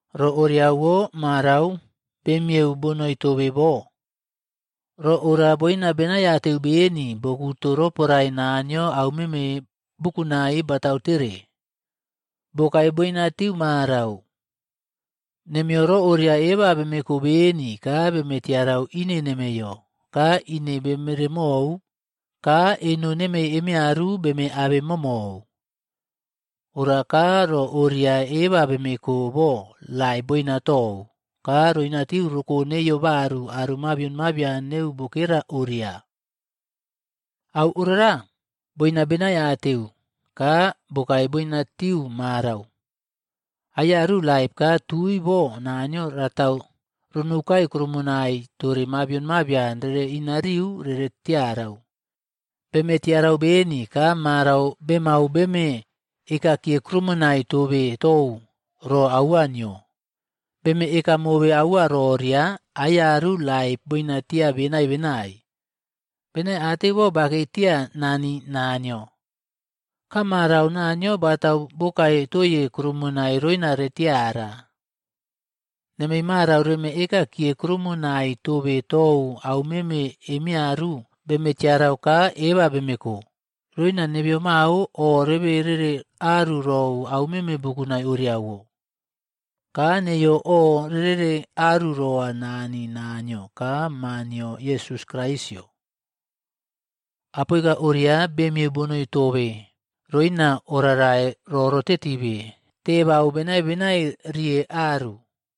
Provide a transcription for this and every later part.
Ro orawo marau bemiyeu bonoi tobe bo, ro ora boina benaiateu beni bokuto roporae Naniyo aumeme bukunai batautere, bokae boina tiu marau. Nemeyo ro oria eba bemeko beni ka beme tiarau ine nemeyo ka ine bemeremou ka eno nemei emiyaru beme abemomou. Ora ka ro oria eba bemeko bo laip boina tou ka roinatiu roko neiyo baru aro mabion mabian neu bokera oria. Au orara boina beni benaiateu ka bokae boinatiu marau, aiyaru laip ka tui bo Naniyo ratau ronoukai kuroumonai tore mabion mabian rere inariu rere tiarau. Beme tiara beni ka marau bemau beme ekakiye kuroumonai tobe tou ro aua nio. Beme eka mobe aua roria, aiyaru laip boinatia benai benai. Benaiateu bo bakei tia Nani Naniyo. Ka marau Naniyo batau bokae toye kuroumonai roina retiara. Nemei marau reme ekakiye kuroumonai tobe tou aumeme emeyaru bemetiarau ka eba bemeko, roina nebeyo mao o rebe rere aru rou aumeme bukunai orewo. Ka neiyo o rerere aru roa Nani Naniyo ka Maa nio Yesus Kraisꞌyo. Apoika oria bemiyeu bonoi tobe roina oꞌrarai roꞌrotetibe tebau benai benai riye aru.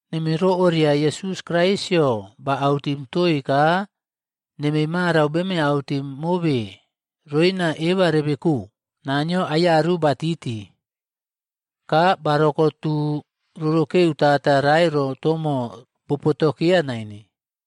Nemei ro oria Yesus Kraisꞌyo ba autim toi ka nemei marau beme autim mobe roina eba rebeko: Naniyo aiyaru batiti. Ka barokotu rorokeu tata rae rotomo bopotokeya naine.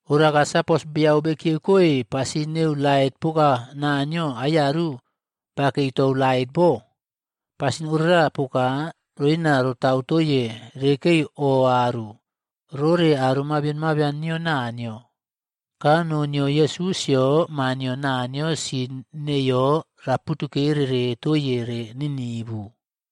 Ora sapos beyau bekiyeukoe pasin neu lait poka Naniyo aiyaru bakei tou lait bo, pasin orara poka roina rotau toiye rekei oꞌaru rore aro mabion mabian nio Naniyo. Ka noo nio Yesusꞌyo Maa nio Naniyo sin neiyo raputukereꞌre toiye re ninivu.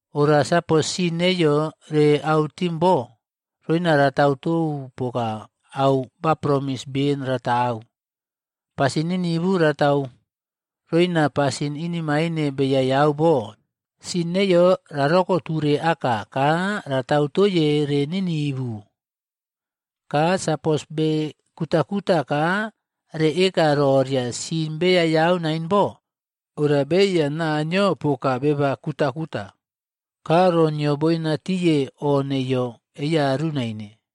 Ora sapos sin neiyo re autim bo, roina ratau tou poka au ba promis ben ratau. Pasin ninivu ratau roina pasin inemaine beyayau bo, sin neiyo rarokoture aka ka ratau toiye re ninivu. Ka sapos bekutakeu ka re eka roria sin beyayau naine bo, ora beꞌeiya Naniyo poka beba kutakuta, ka ro nio boinatiye o neiyo eiyaru naine.